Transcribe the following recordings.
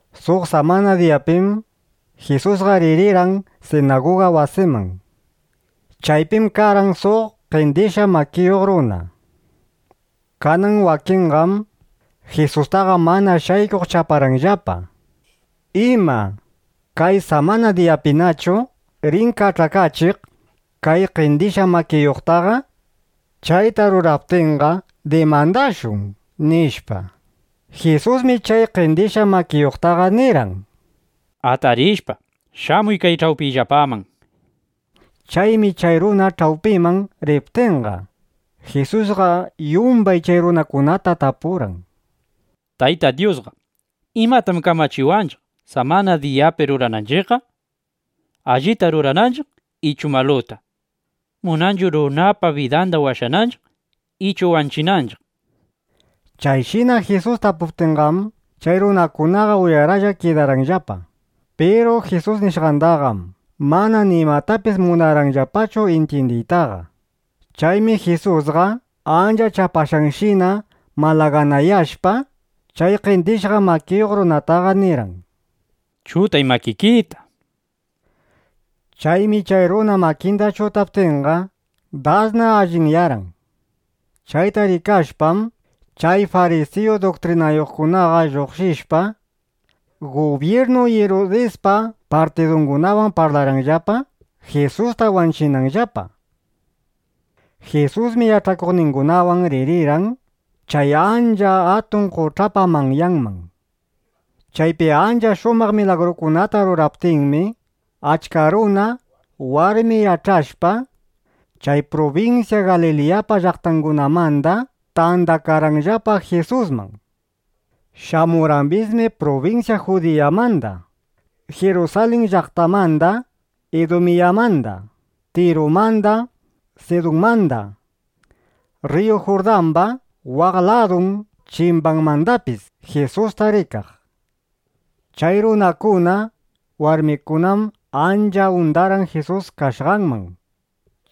Suq samana diyapim Jisusqa ririrqan sinaguga wasiman. Chaypim karqan suq qendishqa makiyuq runa. Kanan wakinqam Jisustaqa mana shaykuq chaparqanllapa: ¿Ima, kay samana diyapinachu rin kach'akachiq kay qendishqa makiyuqtaqa? Chayta ruraptinqa dimandashun, nishpa. Jisusmi chay qendishqa makiyuqtaqa nirqan: —Atarishpa, shamuy kay ch'awpiyllapaman, nishpa. Chaymi chay runa ch'awpiman riptinqa, Jisusqa yumbay chay runakunata tapurqan: —Tayta Dyusqa, ¿imatam kamachiwanchiq, samana diyapi rurananchiqqa? ¿Allita rurananchiq ichu maluta? ¿Munanchu runapa bidanda washananchiq ichu wanchinanchiq? nishpa. Chayshina Jisus tapuptinqam, chay runakunaqa uyaraplla (uyaralla) kidarqanllapa. Piru Jisus nishqandaqam mana nimatapis munarqanllapachu intyindiytaqa. Chaymi Jisusqa ancha chapashqanshina malaganayashpa, chay qendishqa makiyuq runataqa nirqan: —Chutay makikita, nishpa. Chaymi chay runa makinda chutaptinqa, dasna allinyarqan. Chayta rikashpam, chay farisiyu duktrinayuqkunaqa lluqshishpa, gubyirnu Irudispa partidungunawan parlarqanllapa, Jisusta wanchinanllapa. Jisusmi yach'akuqningunawan ririrqan chay ancha atun qoch'apa manyanman. Chaypi ancha shumaq milagrukunata rurariptinmi, achka runa, warmi yach'ashpa, chay prubinsya Galiliyapa llaqtangunamanda tandakarqanllapa Jisusman. Shamurqambismi prubinsya Judiyamanda, Jirusalin llaqtamanda, Idumiyamanda, Tirumanda, Sidunmanda, rriyu Jurdamba waq ladun chimbanmandapis Jisusta rikaq. Chay runakuna, warmikunam ancha undarqan Jisus kashqanman.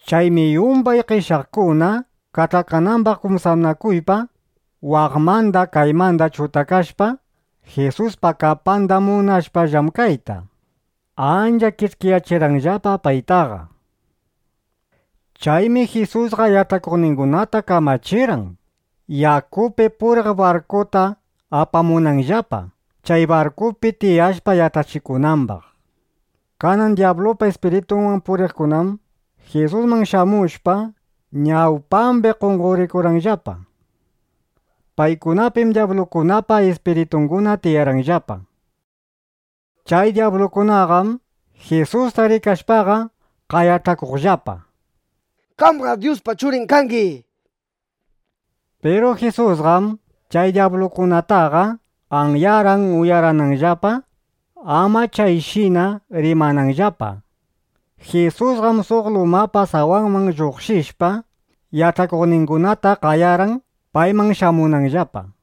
Chaymi yumbay qeshyaqkuna kach'akanambaq kumsanakuypa, waqmanda kaymanda chutakashpa, Jisuspa kapanda munashpa llamkayta, ancha kish'kiyachirqanllapa paytaqa. Chaymi Jisusqa yach'akuqningunata kamachirqan, yakupi puriq barkuta apamunanllapa, chay barkupi tiyashpa yach'achikunambaq. Kanan dyablupa ispiritunwan puriqkunam Jisusman shamushpa, ñawpambi qonqorikurqanllapa. Paykunapim dyablukunapa ispiritunguna tiyarqanllapa. Chay dyablukunaqam Jisusta rikashpaqa qayach'akuqllapa: —¡Qamqam Dyuspa Churin kangi! nishpa. Piru Jisusqam chay dyablukunataqa anyarqan uyarananllapa, ama chayshina rimananllapa. Jisusqam suq lumapa sawanman lluqshishpa, yach'akuqningunata qayarqan, payman shamunanllapa.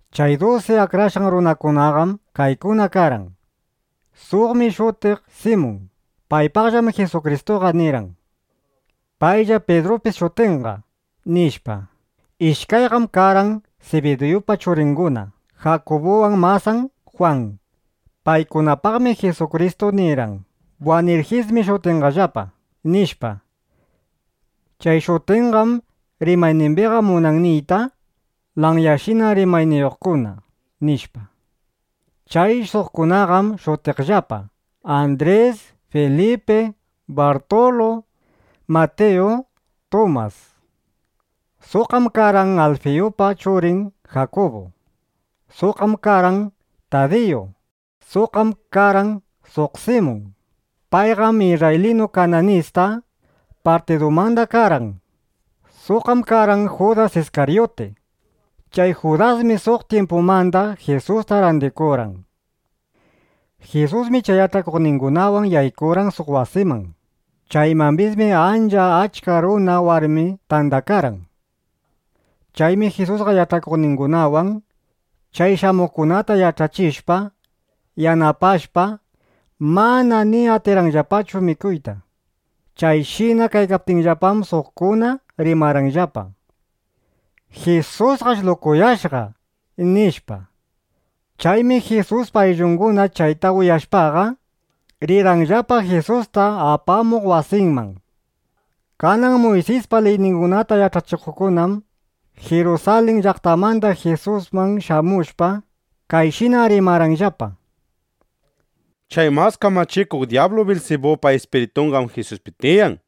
Chay dusi akrashqan runakunaqam kaykuna karqan: Suqmi shutiq Simun. Paypaqllam Jisukristuqa nirqan: “Paylla Pidrupis shutinqa”, nishpa. Ishkayqam karqan Sibidiyupa churinguna Jakubuwan masan Jwan. Paykunapaqmi Jisukristu nirqan: “Buwanirjismi shutinqallapa”, nishpa. Chay shutinqam rimaynimbiqa munan niyta: “Lanyashina rimayniyuqkuna”, nishpa. Chay suqkunaqam shutiqllapa: Andris, Filipi, Bartulu, Matiyu, Tumas. Suqqam karqan Alfiyupa churin Jakubu. Suqqam karqan Tadiyu. Suqqam karqan suq Simun. Payqam isrraylinu Kananista partidumanda karqan. Suqqam karqan Judas Iskaryuti. Chay Judasmi suq tyimpumanda Jisusta randikurqan. Jisusmi chay yach'akuqningunawan yaykurqan suq wasiman. Chaymambismi, ancha achka runa, warmi tandakarqan. Chaymi Jisusqa yach'akuqningunawan chay shamuqkunata yach'achishpa, yanapashpa, mana ni atirqanllapachu mikuyta. Chayshina kaykaptinllapam, suqkuna rimarqanllapa: —Jisusqash lukuyashqa, nishpa. Chaymi Jisuspa ayllunguna chayta uyashpaqa, rirqanllapa Jisusta apamuq wasinman. Kanan Muysispa liyningunata yach'achikuqkunam Jirusalin llaqtamanda Jisusman shamushpa, kayshina rimarqanllapa: —Chay mas kamachikuq dyablu Bilsibupa ispiritunqam Jisuspi tiyan.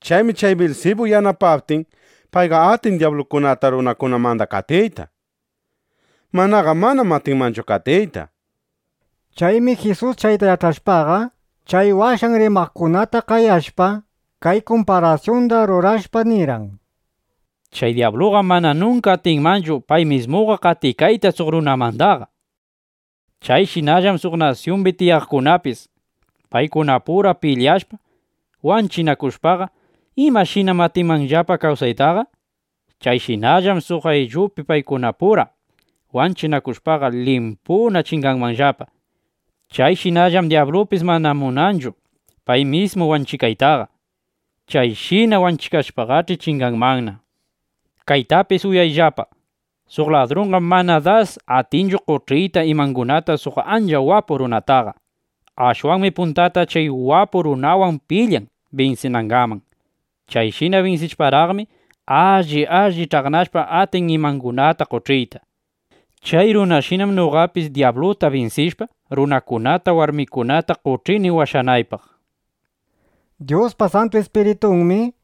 Chaymi chay Bilsibu yanapaptin, payqa atin dyablukunata runakunamanda qatiyta. Manaqa manam atinmanchu qatiyta, nishpa. Chaymi Jisus chayta yach'ashpaqa, chay washan rimaqkunata qayashpa, kay kumparasyunda rurashpa nirqan: —Chay dyabluqam mana nunka atinmanchu pay mismuqa qatikayta suq runamandaqa. Chayshinallam suq nasyumbi tiyaqkunapis paykunapura pilyashpa, wanchinakushpaqa, ¿imashinam atinmanllapa kawsaytaqa? Chayshinallam suq ayllupi paykunapura wanchinakushpaqa limpuna chinganmanllapa. Chayshinallam dyablupis mana munanchu pay mismu wanchikaytaqa. Chayshina wanchikashpaqach'i, chinganmanna. Kaytapis uyayllapa: Suq ladrunqam mana dasqa atinchu qoch'iyta imangunata suq ancha wapu runataqa. Ashwanmi puntata chay wapu runawan pilyan binsinangaman. Chayshina binsishparaqmi, alli alli ch'aqnashpa, atin imangunata qoch'iytaqa. (Chay runashinam noqapis dyabluta binsishpa, runakunata, warmikunata qoch'ini washanaypaq, nishpa.) ’(Dyuspa Santu Ispiritunmi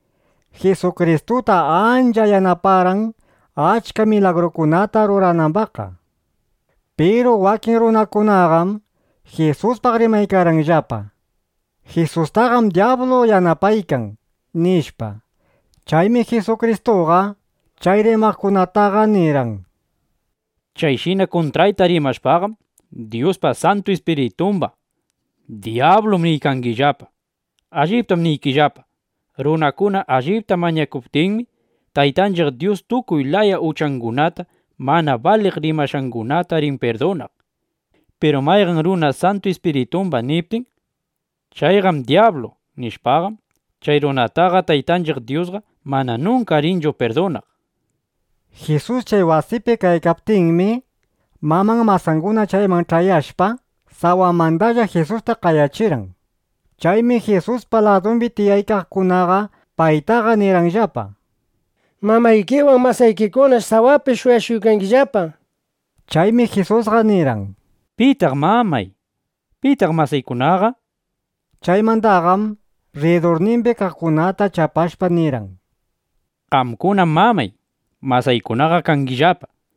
Jisukristuta ancha yanaparqan achka milagrukunata ruranambaqqa.) Piru wakin runakunaqam Jisuspaq rimaykarqanllapa: “Jisustaqam dyablu yanapaykan”, nishpa. Chaymi Jisukristuqam chay rimaqkunataqa nirqan: —(Chayshina kuntrayta rimashpaqam, Dyuspa Santu Ispiritumbaq “dyablum” niykangillapa.) Alliptam niykillapa, runakuna allipta mañakuptinmi, Taytanchiq Dyus tukuy laya uchangunata, mana baliq rimashqangunata rin pirdunaq. Piru mayqan runa Santu Ispiritumbaq niptin: “Chayqam dyablu” nishpaqam, chay runataqa Taytanchiq Dyusqa mana nunka rinchu pirdunaq, nishpa. Jisus chay wasipi kaykaptinmi, maman masanguna chayman ch'ayashpa, sawamandalla Jisusta qayachirqan. Chaymi Jisuspa ladumbi tiyaykaqkunaqa paytaqa nirqanllapa: —Mamaykiwan masaykikunash sawapi shuyashuykangillapa, nishpa. Chaymi Jisusqa nirqan: —¿Pitaq mamay? ¿Pitaq masaykunaqa? Chaymandaqam rridurnimbi kaqkunata chapashpa nirqan: —Qamkunam mamay, masaykunaqa kangillapa.